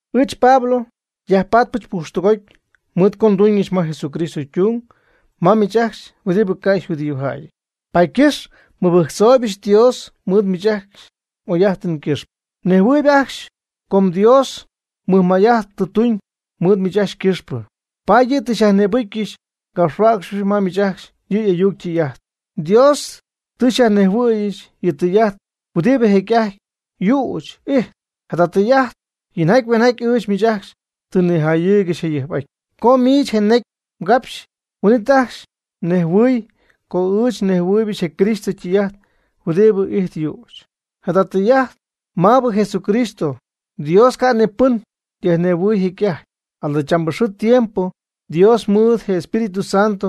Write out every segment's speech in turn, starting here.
Ɨɨch Pablo, nyajpatpɨch pujxtɨgoty mɨɨd co nduuñɨch ma Jesucristo ytung ma miich ajcxy huɨdibɨ ca' yjudíojäyɨty. Paady ycɨxp nmɨbɨjctzooybɨch Dios mɨɨd miich ajcxy m'oy'ajtɨn ycɨxpɨ. Mnejhuɨɨyb ajcxy com Dios mɨjmay'ajt tɨ tuuñ mɨɨd miich ajcxy ycɨxpɨ, paady yɨ' tɨ xyajnïbɨcyɨch ngapxhuäcxɨbɨch ma miich ajcxy yɨ y'ayuc ytɨy'ajt. Dios tɨ xyajnejhuɨ̈yɨch yɨ' ytɨy'ajt huɨdibɨ jecy'ajty yüch y'ijt. Jada tɨy'ajt yinjaty hueeñjaty ɨɨch miich ajcxy tɨ nnijayɨɨygɨxy jayɨjp'aty. Co miich je necy mgapxɨp, huin'it ajcxy mnejhuɨ̈huɨpy co ɨɨch nnejhuɨ̈yɨch je Cristo ytɨy'ajt huɨdibɨ ijtp yüch. Jada tɨy'ajt maabɨ Jesucristo, Dios ca' ni pɨn yajnejhuɨɨy jecy'ajty. Jadachambɨ xɨɨ tiempo Dios mɨɨd je Espíritu Santo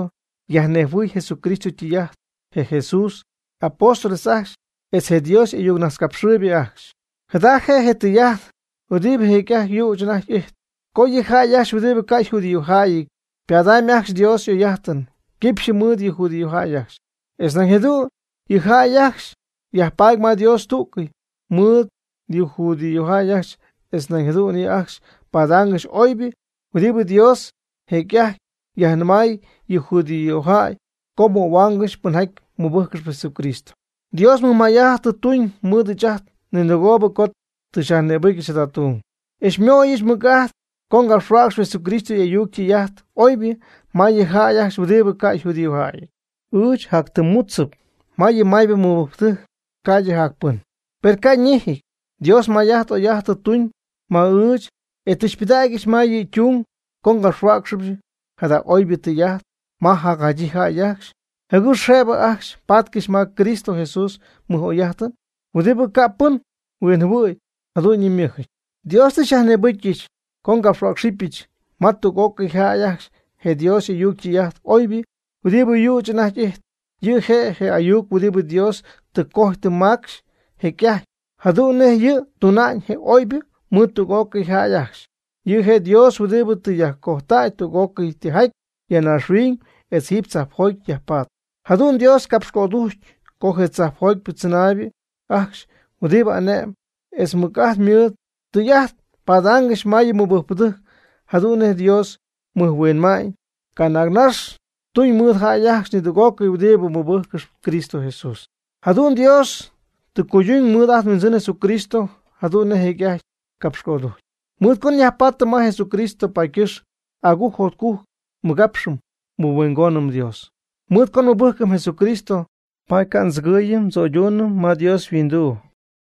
yajnejhuɨ̈y Jesucristo ytɨy'ajt je Jesús y'apóstoles ajcxy etz je Dios y'ayuc najtzcapxɨɨybɨ ajcxy. Jada je' je tɨy'ajt huɨdibɨ jecy'ajty yüch anajty ijtp, co yɨ jäy ajcxy huɨdibɨ ca' yjudíojäyɨty ypadamyb ajcxy Dios y'oy'ajtɨn quipxyɨ mɨɨd yɨ judíojäy ajcxy, etz nañ jadu'n yɨ' ajcxy yajpaady ma Dios tú'cɨy mɨɨd yɨ judíojäy ajcxy, etz nañ jadu'n yɨ' ajcxy padaangɨxy oybɨ huɨdibɨ Dios jecy'ajty yajnɨmay yɨ judíojäy co möhuaangɨxy pɨnjaty mɨbɨjccɨxp Jesucristo. Dios mɨjmay'ajt tɨ tuñ mɨɨd ɨɨch ninɨgoob co tɨ xyajnïbɨcyɨch jada tung, e xymöyɨch mɨc'ajt co ngapxhuäcxɨbɨch Jesucristo y'ayuc ytɨy'ajt oybɨ ma yɨ jäy ajcxy huɨdibɨ ca' yjudíojäyɨty. Ɨɨch jactɨmmudzɨp ma yɨ maybɨ mɨbɨjcpɨdɨjc ca'ydɨ jacpɨn, per ca' ñejɨty. Dios may'ajt oy'ajt tɨ tuuñ ma ɨɨch, e tɨ xypɨdägyɨch ma yɨ' ytung co ngapxhuäcxyɨch jada oybɨ tɨy'ajt ma jacjadyii jäy ajcxy jɨgɨx jëbɨ ajcxy patcɨxy ma Cristo Jesús mɨj'oy'ajtɨn, huɨdibɨ ca' pɨn huinjɨhuɨ̈y jadu'ñyɨ ymɨjɨty. Dios tɨ xyajnïbɨcyɨch co ngapxtɨ̈cxɨbɨch ma tüg'ócɨy jäy ajcxy je Dios y'ayuc ytɨy'ajt oybɨ huɨdibɨ yüch anajty ijtp. Yɨ' je' je ayuc huɨdibɨ Dios tɨ cojy tɨ macxy jecy'ajty, jadu'n nej yɨ' tuna'ñ je oybɨ mɨɨd tüg'ócɨy jäy ajcxy. Yɨ' je' Dios huɨdibɨ tɨ yajcojtäy tüg'ócɨy tijaty ya naaxhuiñ etz jiiby tzajpjoty yajpatp. Jadu'n Dios capxcödujcy co je tzajpjoty tzɨnaaybɨ ajcxy huɨdibɨ ane'mɨn etz mɨc'ajt mɨɨd, tɨy'ajt padaangɨxy ma yɨ mɨbɨjcpɨdɨjc jadu'n nej Dios mɨjhuinma'ñ canaagnax tuñ mɨɨd jäy ajcxy nidüg'ócɨy huɨdibɨ mɨbɨjccɨxp Cristo Jesús. Jadu'n Dios tɨ cuyduuñ mɨɨd ajt nHuindzɨn Jesucristo jadu'n nej jecy'ajty capxcödujcy. Mɨɨd co nyajpaatɨm ma Jesucristo paady ycɨxp agujc jotcujc nmɨgapxɨm nmɨhuingonɨm Dios. Mɨɨd co nmɨbɨjcɨm Jesucristo paady ca' ndzɨgɨɨyɨm ndzo'yduunɨm ma Dios yhuinduu.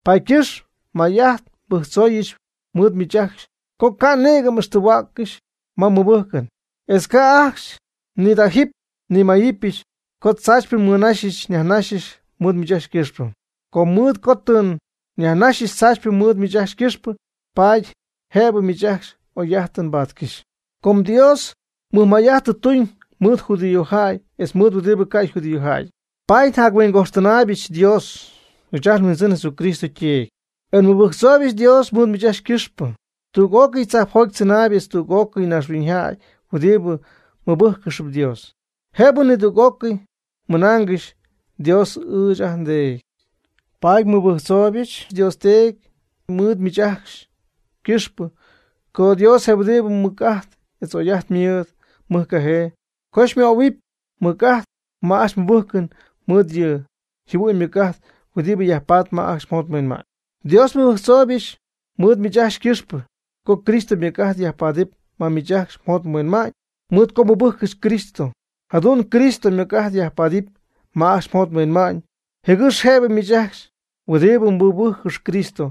Paady ycɨxp may'ajt nbɨjctzooyɨch mɨɨd miich ajcxy co ca' nïgɨ m'ixtɨgɨ̈huäccɨxy ma ajcxy mmɨbɨjcɨn. Etz ca'ajcxy xyñidajɨ́py xyñimayɨ́pyɨch co tzaachypɨ nmɨnaxyɨch nyajnaxyɨch mɨɨd miich ajcxy ycɨxpɨ. Com mɨɨd co tɨ nyajnaxyɨch tzaachypɨ mɨɨd miich ajcxy ycɨxpɨ, paady jëbɨ miich ajcxy oy'ajtɨn mbatcɨxy. Com Dios mɨjmay'ajt tɨ tuuñ mɨɨd judíojäy etz mɨɨd huɨdibɨ ca' yjudíojäyɨty, paady njatyhuingojxtɨnaaybɨch Dios, ɨɨch ajt nHuindzɨn Jesucristo yTeedy, e nmɨbɨjctzooybɨch Dios mɨɨd miich ajcxy ycɨxpɨ. Tüg'ócɨy tzajpjoty tzɨnaayb etz tüg'ócɨy naaxhuiñyjäy huɨdibɨ mɨbɨjccɨxp Dios, jëbɨ nidüg'ócɨy ymɨnaangɨxy: “Dios ɨɨch ajt nDeedy.” Paady nmɨbɨjctzooybɨch Dios Teedy mɨɨd miich ajcxy ycɨxpɨ, co Dios je huɨdibɨ mɨc'ajt etz oy'ajt ymɨɨd mɨjcajee, co xymöhuɨpy mɨc'ajt ma ajcxy mmɨbɨjcɨn mɨɨd yɨ' yjɨhuɨ'ñ ymɨc'ajt huɨdibɨ yajpatp ma ajcxy mjot mhuinma'ñ. Dios nmɨbɨjctzooybɨch mɨɨd miich ajcxy ycɨxpɨ co Cristo ymɨc'ajt yajpaadɨp ma miich ajcxy mjot mhuinma'ñ mɨɨd co mmɨbɨjccɨxy Cristo. Jadu'n Cristo ymɨc'ajt yajpaadɨp ma ajcxy mjot mhuinma'ñ, jɨgɨx jëbɨ miich ajcxy huɨdibɨ mmɨbɨjccɨxp Cristo,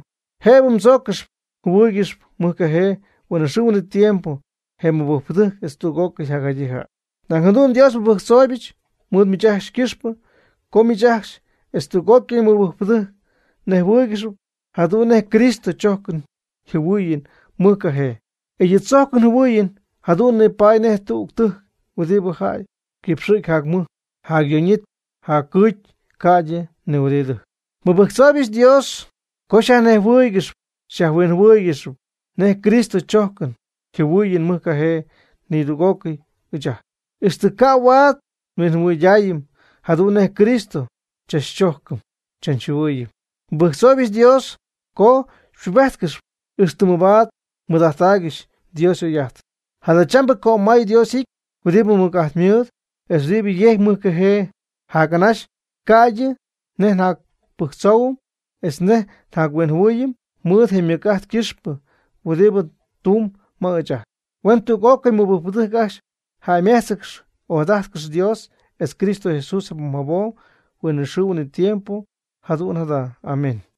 jëbɨ mdzójcɨxɨpy mjɨhuɨ́ɨygɨxɨpy mɨjcajee huinɨxɨɨ huinɨtiempo je mɨbɨjcpɨdɨjc etz tüg'ócɨy jacjadyii jäy. Nañ jadu'n Dios nmɨbɨjctzooybɨch mɨɨd miich ajcxy ycɨxpɨ co miich ajcxy etz tüg'ócɨy mɨbɨjcpɨdɨjc mnejhuɨ́ɨygɨxɨpy jadu'n nej Cristo xychojcɨm xyjɨhuɨɨyɨm mɨjcajee. E yɨ' chojcɨn yjɨhuɨɨyɨn jadu'n nipaady nej tüg tɨjc huɨdibɨ jac cɨxɨp jac mɨjɨp, jac yooñɨp jac cɨɨcyɨp ca'ydɨ ni huɨdi tɨjc. Nmɨbɨjctzooybɨch Dios co xyajnejhuɨ́ɨygɨxyɨp xyajhuinjɨhuɨ́ɨygɨxɨpy nej Cristo xychojcɨm xyjɨhuɨɨyɨm mɨjcajee nidüg'ócɨy ɨɨch ajt, ixtɨ ca' huaad nhuinjɨhuɨydaayɨm jadu'n nej Cristo xychachchojcɨm xychachjɨhuɨɨyɨm. Nmɨbɨjctzooybɨch Dios co xypubéjtcɨxɨp, ixtɨ mabaad mmɨɨd'ajttaaygɨxy Dios y'oy'ajtɨn. Jadachambɨ, cömay Dios y'ity huɨdibɨ mɨc'ajt mɨɨd, etz huɨdi yejcp mɨjcajee jac'anaxy ca'ydɨ nej njapɨjctzoohuɨm etz nej njahuinmaayɨm, mɨɨd je ymɨc'ajt ycɨxpɨ huɨdi tumb ma ɨɨch ajt. Huen tüg'ócɨy mɨbɨjcpɨdɨjc ajcxy jäymejtzcɨxy ojadájtcɨxy Dios etz Cristo Jesús jabom jabom huinɨxɨɨ huinɨtiempo. Jadu'n jada. Amén.